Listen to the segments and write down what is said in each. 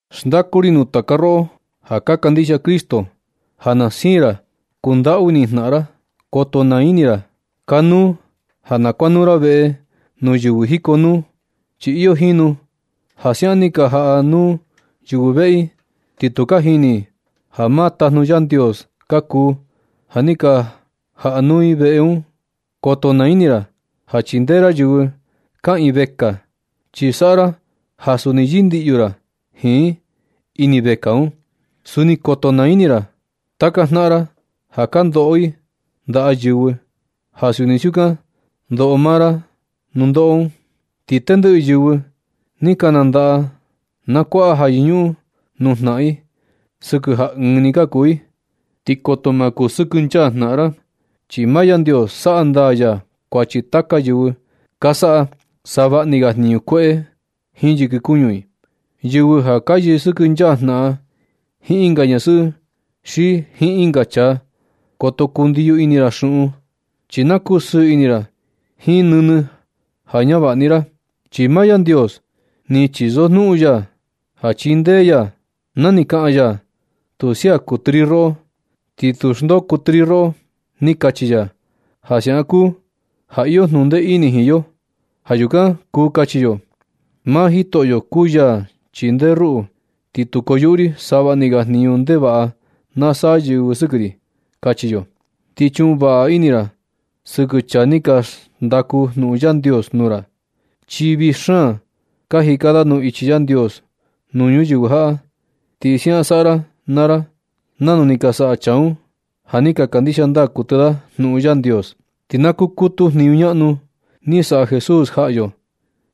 Xndaku ri nuu taka roꞌo ja ka kandixia Cristo ja na siin ra kundaꞌu ini jnaꞌan ra. Koto naa ini ra ja kanuu ja na kuanuu ra veꞌe nuu yɨvɨ jikonuu, chi iyo jinu ja siaꞌan ni ka jaꞌa nuu yɨvɨ veꞌe i, ti tu ka jini i ja maa tajnu Yandios ka kuu ja ni ka jaꞌa nuu i veꞌe nuu un. Koto naa ini ra ja chindee ra yɨvɨ kaꞌiin vekaa, chi saꞌa ra ja suni yɨndiꞌyu ra jiin i ini vekaa un. Suni koto naa ini ra taka jnaꞌan ra ja ka ndoꞌo i ndaꞌa yɨvɨ, ja suni siukan ndoꞌo maa ra nundoꞌo un. Ti tendɨꞌɨ yɨvɨ ni ka nandaꞌa, na kuaꞌa ja yɨñuꞌun nuu jnaꞌan i sɨkɨ ja ɨɨn ni ka kuu i, ti koto ma kusɨkɨnchaa jnaꞌan ra. Chi maa Yandios saꞌa ndaa ya kuachi taka yɨvɨ ka saꞌa savaꞌni ga jniñu kueꞌe un jiin yɨkɨ kuñu i, yɨvɨ ja ka yɨsɨkɨnchaa jnaꞌan jiin ɨnga ñasɨꞌɨ xi jiin ɨnga chaa. Koto kundiyo ini ra xuꞌun, chi na kuu sɨɨ ini ra jiin nɨnɨ ja ñavaꞌa ni ra. Chi maa Yandios ni chisojnuꞌun ya ja chindee ya na ni kaꞌan ya: “Tu sia kuɨtɨ ri roꞌo, ni tu xndoo kuɨtɨ ri roꞌo”, ni kachi ya. Ja siaꞌan kuu ja iyo jnuꞌun ndee ini jiin yo. Ja yukan kuu kachi yo: Maa Jitoꞌo kuu ya chindee ruꞌu, ti tu koyuꞌu ri savaꞌni ga jniñu ndevaꞌa na saꞌa yɨvɨ sɨkɨ ri. Kachi yo. Ti chuꞌun vaꞌa ini naa ra sɨkɨ chaa ni ka xndaku jnuꞌun Yandios nuu ra, chi vii xaan ka jika da nuu ichi Yandios nuu ñuyɨvɨ jaꞌa. Ti siaꞌan saꞌa ra naa ra nanu ni ka saꞌa chaa un ja ni ka kandixia ndaa kuɨtɨ da jnuꞌun Yandios. Ti na kukutu jniñu ñaꞌnu ni saꞌa Jesús jaꞌa yo,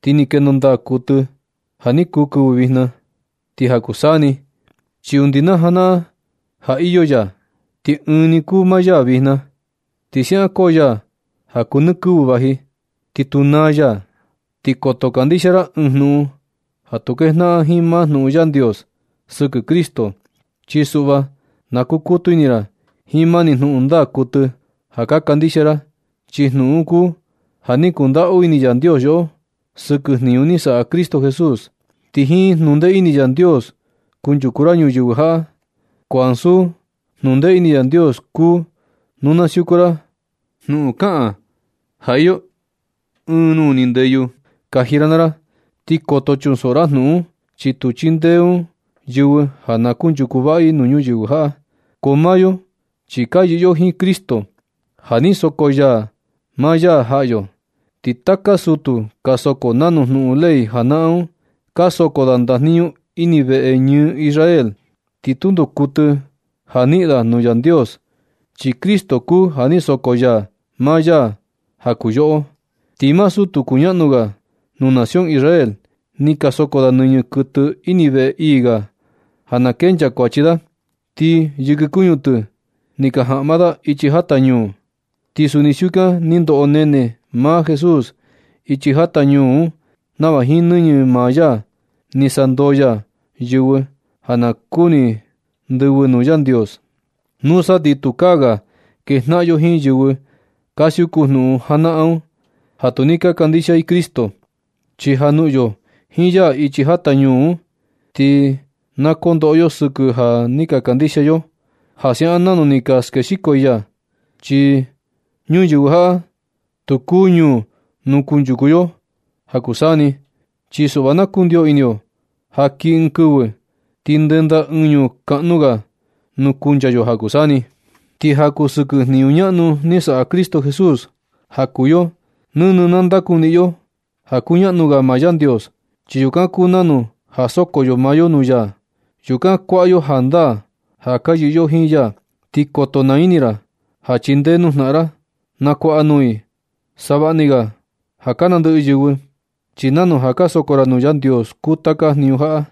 ti ni kendo ndaa kuɨtɨ ja kuu kɨvɨ vijna, ti ja kuu saa ni, chi undi na janaꞌan ja iyo ya, ti ɨɨn ni kuu maa ya vijna. Ti siaꞌan koo ya ja kuu nɨ kɨvɨ vaji, ti tu naa ya. Ti koto kandixia ra ɨɨn jnuꞌun ja tu kejnaꞌan jiin maa jnuꞌun Yandios sɨkɨ Cristo. Chi suꞌva na kukutu ini ra jiin mani jnuꞌun ndaa kuɨtɨ ja ka kandixia ra, chi jnuꞌun un kuu ja ni kundaꞌu ini Yandios yoꞌo, sɨkɨ jniñu ni saꞌa Cristo Jesús. Ti jiin jnundee ini Yandios kunchuku ra ñuyɨvɨ jaꞌa, ko ansu jnundee ini Yandios kuu nu na siuku ra jnuꞌun kaꞌan ja iyo ɨɨn nuu ni ndeyu kaji ra naa ra. Ti koto chunsoꞌo ra jnuꞌun un, chi tu chindee un yɨvɨ ja na kunchuku vaꞌa i nuu ñuyɨvɨ jaꞌa. Ko maa yo, chi ka yɨꞌɨ yo jiin Cristo ja ni soko ya maa ya jaꞌa yo. Ti taka sutu ka soko nanu jnuꞌun ley janaꞌan un, ka soko da ndajniñu ini veꞌe ñɨɨ Israel. Ti tundo kuɨtɨ ja niꞌin da nuu Yandios, chi Cristo kuu ja ni soko ya maa ya ja kuu yoꞌo. Ti maa sutu kuñaꞌnu ga nuu nación Israel, ni ka soko da nɨñɨ kuɨtɨ ini veꞌe ii ga un ja na kenchaa kuachi da, ti yɨkɨ kuñu tɨ ni ka jaꞌma da ichi jata ñuu. Ti suni siukan ni ndoꞌo nene maa Jesús ichi jata ñuu un nava jiin nɨñɨ maa ya ni sandoo ya yɨvɨ ja ka kuni ndɨvɨ nuu Yandios. Nusa ti tukaa ga kejnaꞌan yo jiin yɨvɨ ka siuku jnuꞌun janaꞌan un, ja tu ni ka kandixia i Cristo. Chi ja noꞌon yo jiin ya ichi jata ñuu un, ti na kondoꞌo yo sɨkɨ ja ni kandixia yo ya siaꞌan nanu ni ka skexiko i ya. Chi ñuyɨvɨ jaꞌa tu kuu ñuu nuu kunchuku yo ja kuu saa ni. Chi suꞌva na kundio ini yo ja kii ɨɨn kɨvɨ, ti ndenda ɨɨn ñuu kaꞌnu ga nuu kuncha yo ja kuu saa ni. Ti ja kuu sɨkɨ jniñu ñaꞌnu ni saꞌa Cristo Jesús ja kuu yo, nɨnɨ na ndakuniꞌin yo ja kuñaꞌnu ga maa Yandios, chi yukan kuu nanu ja soko yo maa yo nuu ya. Yukan kuaꞌa yo jandaa ja ka yɨꞌɨ yo jiin ya. Ti koto naa ini ra ja chindee nuu jnaꞌan ra. Na kuaꞌa nuu i savaꞌni ga ja ka nandɨꞌɨ yɨvɨ. Chi nanu ja ka soko ra nuu Yandios kuu taka jniñu jaꞌa.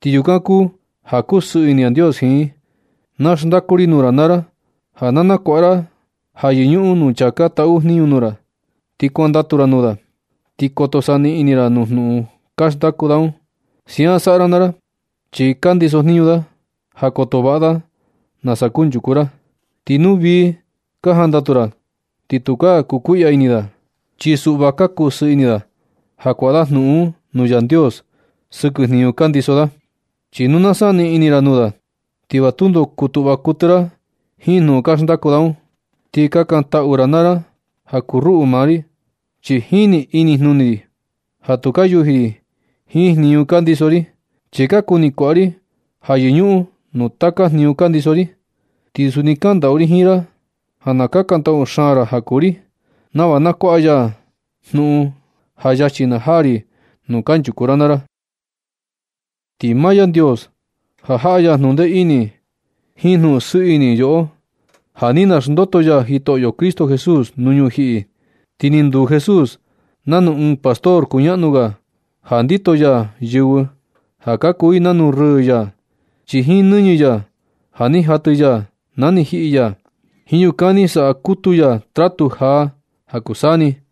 Ti yukan kuu ja kusɨɨ ini Yandios jiin. Na xndaku ri nuu ra naa ra ja na kuaꞌa ra ja yɨñuꞌun nuu chaa ka taꞌu jniñu nuu ra. Ti kuandatu ra nuu da, ti koto saniꞌin ini ra nuu jnuꞌun ka xndaku da un. Siaꞌan saꞌa ra naa ra, chi ka ndiso jniñu da ja koto vaꞌa da nasa kunchuku ra. Chi nu vii ka jandatu ra, ti tu ka kukuiꞌya ini da. Chi suꞌva ka kusɨɨ ini da ja nakuaꞌa da jnuꞌun un nuu Yandios sɨkɨ jniñu ka ndiso da. Chi nu na saniꞌin ini ra nuu da, ti va tundo kutuꞌva kuɨtɨ ra jiin jnuꞌun ka xndaku da un. Ti kakantaꞌu naa ra ja kuu ruꞌu naa ri, chi jini inijnuni ri ja tu ka yuji ri jiin jniñu ka ndiso ri. Chi ka kuni kuaꞌa ri ja yɨñuꞌun nuu taka jniñu ka ndiso ri. Ti suni kaꞌan ndaꞌu ri jiin ra ja na kakantaꞌu xaan ra ja kuu ri, nava na kuaꞌa ya jnuꞌun ja yachi na jaa ri nuu kanchuku ra naa ra. Ti maa Yandios ja jaꞌa ya jnuꞌun ndee ini jiin jnuꞌun sɨɨ ini yoꞌo, ja ni naxndoto ya Jitoꞌo Cristo Jesús nuu ñujiꞌi. Ti ni nduu Jesús nanu ɨɨn pastor kuñaꞌnu ga ja ndito ya yɨvɨ ja ka kuu i nanu rɨɨ ya. Chi jiin nɨñɨ ya ja ni jatɨ ya na ni jiꞌi ya, jiin yukan ni saꞌa kutu ya tratu jaa ja kuu saa ni.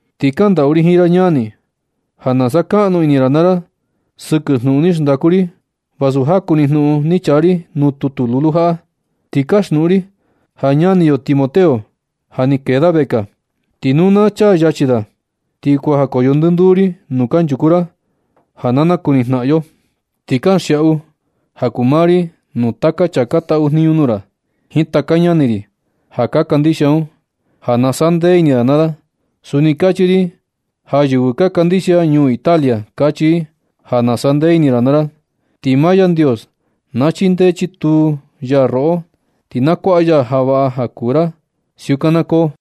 Ti kaꞌan ndaꞌu ri jiin ra ñani, ja na sakaꞌnu ini ra naa ra sɨkɨ jnuꞌun ni xndaku ri vasu jaku ni jnuꞌun ni chaa ri nuu tutu lulu jaꞌa. Ti kaxnuꞌun ri ja ñani yo Timoteo, ja ni kee da vekaa. Ti nu na chaa yachi da, ti kuajakoyo ndɨnduu ri nuu kanchuku ra ja na nakuni jnaꞌan yo. Ti kanxiaꞌu ja kuu maa ri nuu taka chaa ka taꞌu jniñu nuu ra, jiin taka ñani ri ja ka kandixia un, ja na sandee ini da naa da. Suni kachi ri ja yɨvɨ ka kandixia ñuu Italia, kachi i ja na sandee ini ra naa ra. Ti maa Yandios na chindee chituu ya roꞌo, ti na kuaꞌa ya ja vaꞌa ja kuu ra. Siukan na koo.